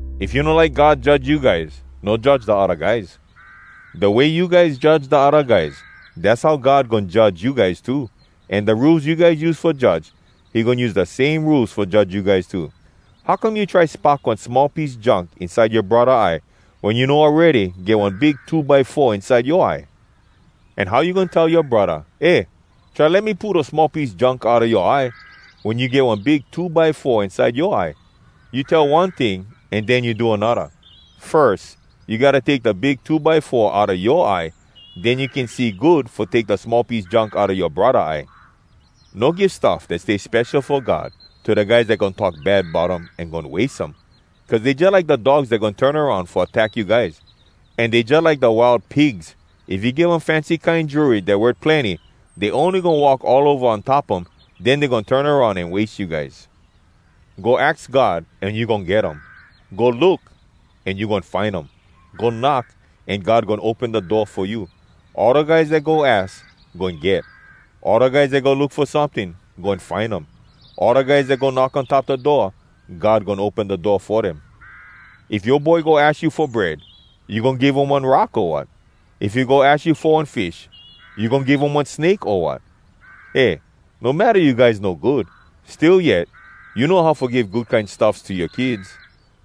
“If you no like God judge you guys, no judge da odda guys. Da way you guys judge da odda guys, dass how God goin judge you guys too. An da rules you guys use fo judge, he goin use da same rules fo judge you guys too. “How come you try spock one small piece junk inside yoa braddah eye wen you know awready get one big two by four inside yoa eye. An how you goin tell yoa braddah, ‘Eh, try let me pull da small piece junk outa yoa eye,’ wen you get one big two by four inside yoa eye? You tell one ting an den you do anodda! Firs you gotta take da big two by four outa yoa eye. Den you can see good fo take da small piece junk outa yoa braddah eye. “No give stuff dat stay spesho fo God to da guys dat goin talk bad bout um an goin wase um. Cuz dey jalike da dogs dat goin turn aroun fo attack you guys. An dey jalike da wild pigs—if you give um fancy kine jewelry dat worth plenny, dey ony goin walk all ova on top um. Den dey goin turn aroun an wase you guys. “Go aks God, an you goin get um. Go look, an you goin find um. Go knock, an God goin open da door fo you. All da guys dat go aks, goin get. All da guys dat go look fo someting, goin find um. All da guys dat go knock on top da door, God goin open da door fo dem. If yoa boy go aks you fo bread, you goin give um one rock, o wat? If he go aks you fo one fish, you goin give um one snake, o wat? Eh, no matta you guys no good, still yet you know how fo give good kine stuffs to yoa kids.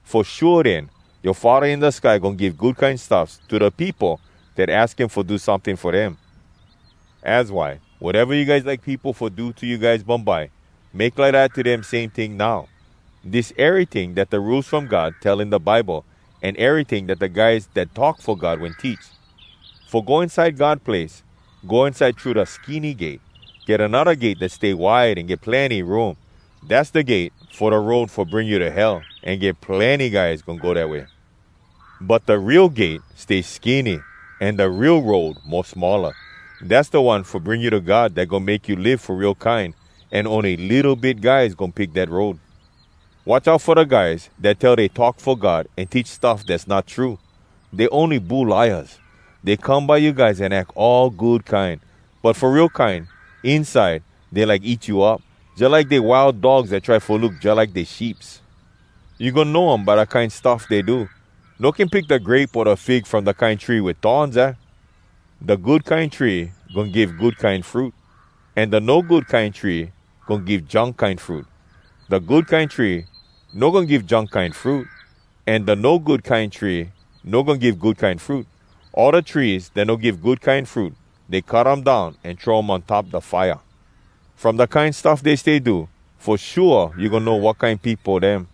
Fo shua den, yoa Faddah in da sky goin give good kine stuffs to da peopo dat aks him fo do someting fo dem. Az why, wateva you guys like peopo fo do to you guys bumbye, make lidat to dem, same ting, now. Dis eryting dat da Rules From God tell in da Bible, an eryting dat da guys dat talk fo God wen teach. “Fo go inside God place, go inside thru da skinny gate. Get anodda gate dat stay wide an get plenny room. Dass da gate fo da road fo bring you to Hell, an get plenny guys goin go dat way. But da real gate stay skinny an da real road mo smalla. Dass da one fo bring you to God dat goin make you live fo real kine, an ony litto bit guys goin pick dat road. “Watch out fo da guys dat tell dey talk fo God an teach stuff dass not true. Dey ony bulaias. Dey come by you guys an ack all good kine, but fo real kine, inside dey like eat you up, jalike dey wild dogs dat try fo look jalike dey sheeps. You goin know um by da kine stuff dey do. No can pick da grape o da fig from da kine tree wit thorns, aah? Da good kine tree goin give good kine fruit, an da no good kine tree goin give junk kine fruit. Da good kine tree no goin give junk kine fruit, an da no good kine tree no goin give good kine fruit. All da trees dat no give good kine fruit, dey cut um down an throw um on top da fire. From da kine stuff dey stay do, fo shua you goin know wat kine peopo dem.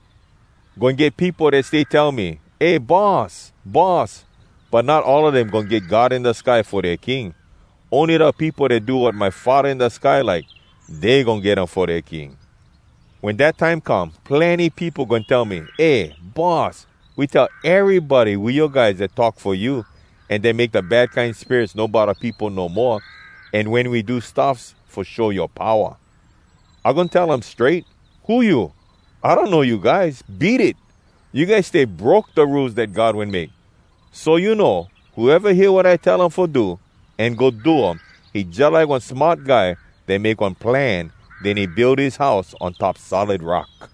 “Goin get peopo dat stay tell me, ‘Eh Boss! Boss!’ But not all a dem goin get God in da sky fo dea King. Ony da peopo dat do wat my Faddah in da sky like, dey goin get him fo dea King. Wen dat time come, plenny peopo goin tell me, ‘Eh, Boss, we tell erybody we yoa guys dat talk fo you, an dat make da bad kine spirits no bodda peopo no moa, an wen we do stuffs fo show yoa powa.’ I goin tell um strait, ‘Who you? I donno you guys. Beat it! You guys stay broke da Rules dat God wen make.’ “So you know, whoeva hear wat I tell um fo do, an go do um, he jalike one smart guy dat make one plan, den he build his house on top solid rock.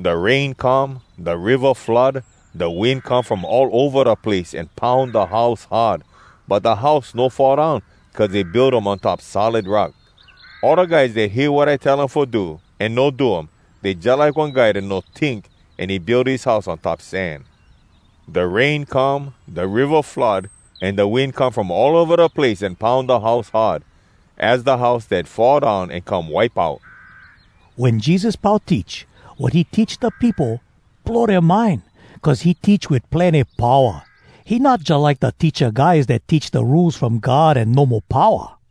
Da rain come, da riva flood, da wind come from all ova da place, an poun da house hard. But da house no fall down cuz he build um on top solid rock. “All da guys dat hear wat I tell um fo do, an no do um, dey jalike one guy dat no tink, an he build his house on top sand. Da rain come, da riva flood, an da wind come from all ova da place an poun da house hard. Az da house dat fall down an come wipe out!” Wen Jesus pau teach, wat he teach da peopo blow dea mind cuz he teach wit plenny powa. He not jalike da teacha guys dat teach da Rules From God an no mo powa.